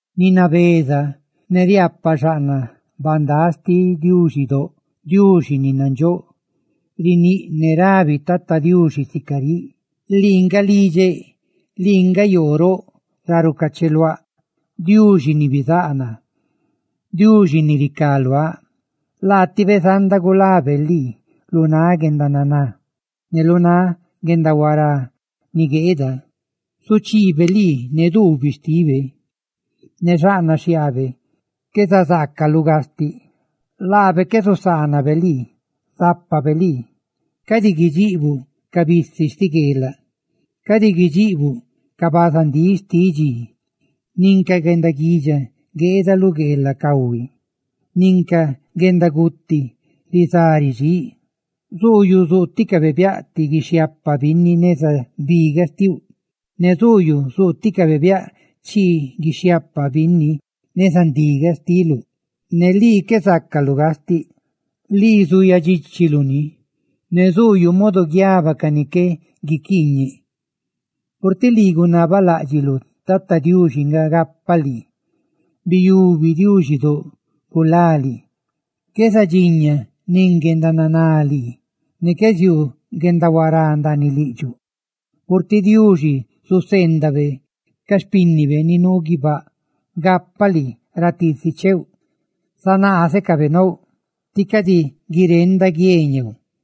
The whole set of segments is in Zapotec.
Ni nabeza ne riaapaꞌ xaꞌnaꞌ bandáꞌxtiꞌ Diuxidóꞌ, Diuxi ni nandxóꞌ, riníꞌ ne rabi Tata Diuxi sica riꞌ: «Lii nga lidxeꞌ, lii nga yoo roꞌ ra rucacheluáꞌ, ¡Diuxi ni bizáꞌ naa, Diuxi ni ricá luáꞌ!» Laatibe zanda gulabe lii lu náꞌ guendananá ne lu náꞌ guendahuará ni gueeda, zuchiibe lii ne xhiaabe, ne xaꞌnaꞌ xhiaabe qué zazaacaluꞌ gastiꞌ. ¡Laabe qué zusaanabe lii, zápabe lii! Cadi guidxiꞌbuꞌ ca bisi xtiꞌ gueelaꞌ, cadi guidxiꞌbuꞌ ca bazandíꞌ xtiꞌ dxi, nin ca guendaguidxa gueeda lu gueelaꞌ cahui, nin ca guendaguti rizá ridxíꞌ; zuuyuꞌ zuuticabe biaꞌ ti guixhiaapa binni neza bigaꞌ xtiuꞌ, ne zuuyuꞌ zuuticabe biaꞌ chii guixhiaapaꞌ binni neza ndigaꞌ xtiuꞌ, ne lii qué zácaluꞌ gastiꞌ. Lii zuuyaꞌ dxíchiluꞌ ni: ne zuuyuꞌ modo guiaba ca ni qué guiquiiñe. Purtiꞌ lii gunabaladxiꞌluꞌ Tata Diuxi nga gapa lii, biyubuꞌ Diuxidóꞌ gulá lii, qué zadxiña nin guendananá lii, ne qué ziuu guendahuará ndaaniꞌ lidxuꞌ; purtiꞌ Diuxi zuseendabe ca xpínnibe ni nuu guibáꞌ gapaꞌ lii ra tiisi cheuꞌ. Zandíscabe lii ne nácabe tí cadi guirenda nin ti guie ñeeu.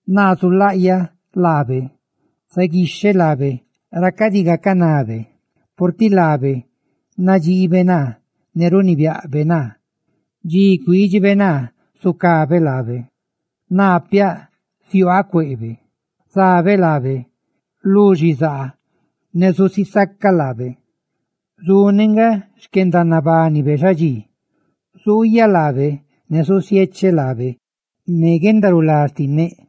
«Naa zulaꞌyaꞌ laabe, zaguixheꞌ laabe ra cadi gacanabe, purtiꞌ laabe nadxiibe naa ne runibiaꞌbe naa. Dxi cuídxibe naa, zucabe laabe; ¡naa piaꞌ ziuaaꞌ cueꞌbe! Zabeeꞌ laabe lu xizaa ne zusisacaꞌ laabe; zusigaa xquendanabanibe xadxí, ¡zulaꞌyaꞌ laabe ne zusiecheꞌ laabe ne guendarulá xtinneꞌ!»